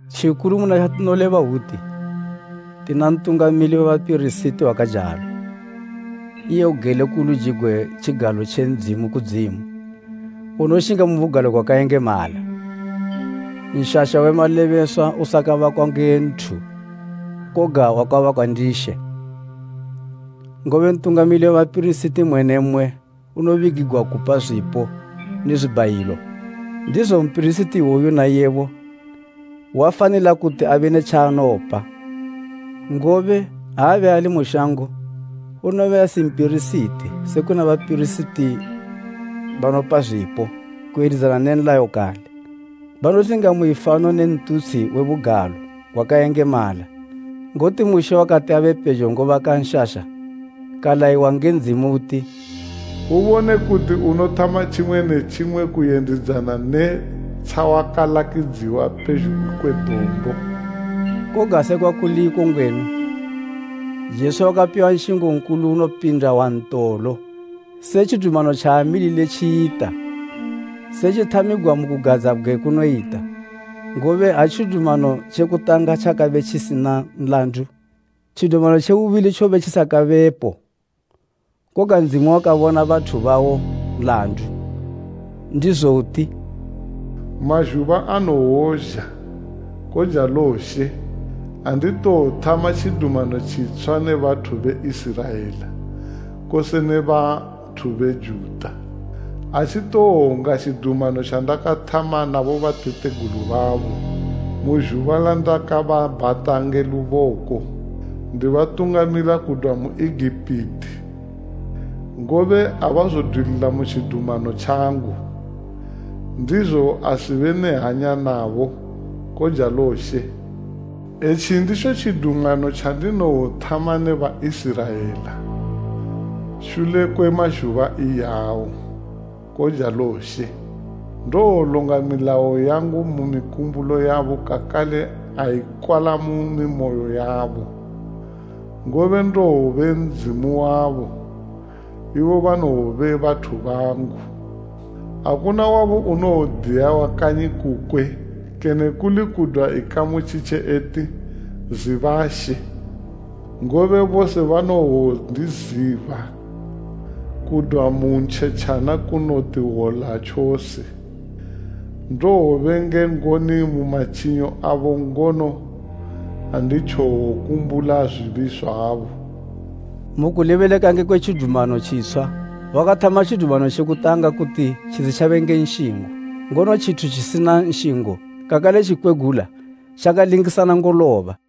Tjikulu muna tjatinoleba hwuti, tina Ntungamili we bapirisiti wakajalo, iye ugele ku luji gwe tjigalo tje Ndzimu kudzimu, unoshinga mu Bugalo gwakayengemala, Nshasha Nshasha: Kene “Ng'umba ye Ndzimu.” we malebeswa usakabakwa nge nthu koga wakabakwa ndi She. Ngobe Ntungamili we bapirisiti mmwe ne mmwe unobigigwa kupa zwipo ne zwibhayilo, ndizo mpirisiti iwoyu naiyebo wafanila kuti abe ne tjaanopa. Ngobe ha abe ali mu shango, unobe asi mpirisiti, se kuna bapirisiti banopa zwipo kuyendidzana ne nlayo kale. Banoshinga mu ifano ne ntutshi we bugalo gwakayengemala, ngoti Mushe wakati abe pejo ngobaka nshasha kalayiwa nge Ndzimu uti, “Ubone kuti unothama tjimwe ne tjimwe kuyendidzana ne tjawakalakidziwa pezhugwi kwe dombo.” Koga sekwa kuli iko ngwenu, Jesu wakapiwa nshingo nkulu unopinda wantolo se tjidumano tjaamilile tjiyita, setjithamigwa mu kugadzabgwe kunoyita. Ngobe ha tjidumano tje kutanga tjakabe tjisina nlandu, tjidumano tje bubili tjobe tjisakabepo. Koga Ndzimu wakabona bathu bawo nlandu, ndizo uti, “Mazhuba anowozha, kojalo She, andinowothama Tjidumano tjitshwa ne bathu be Iziraela, kose ne bathu be Juda. Atjitowonga tjidumano tjandakathama na bobatategulu babo, mu zhuba landakababhata nge luboko, ndibatungamila kudwa mu Egipiti. Ngobe abazodwilila mu tjidumano tjangu, ndizo asibe ne hanya nabo, kojalo She. Etji nditjo tjidumano tjandinowothama ne Baiziraela, shule kwe mazhuba iyawo, kojalo She. Ndowolonga milayo yangu mu mikumbulo yabo kakale aikwala mu mimoyo yabo. Ngobe ndowobe Ndzimu wabo, ibo banowobe bathu bangu. Akuna wabo unowodiya wa kanyi kukwe kene kuli kudwa ikamu tjitje eti, ‘Ziba She.’ Ngobe bose banowondiziba, kudwa mu ntjetjana kunoti hwola tjose. Ndowobe nge ngoni mu matjinyo abo ngono anditjowokumbula zwibi zwabo.” Mu kulebeleka ngekwe “Tjidumano tjitshwa,” wakathama tjidumano tje kutanga kuti tjisitjabe ne nshingo. Ngono tjithu tjisitjina nshingo kakale tjikwegula tjakalingisana ngoloba.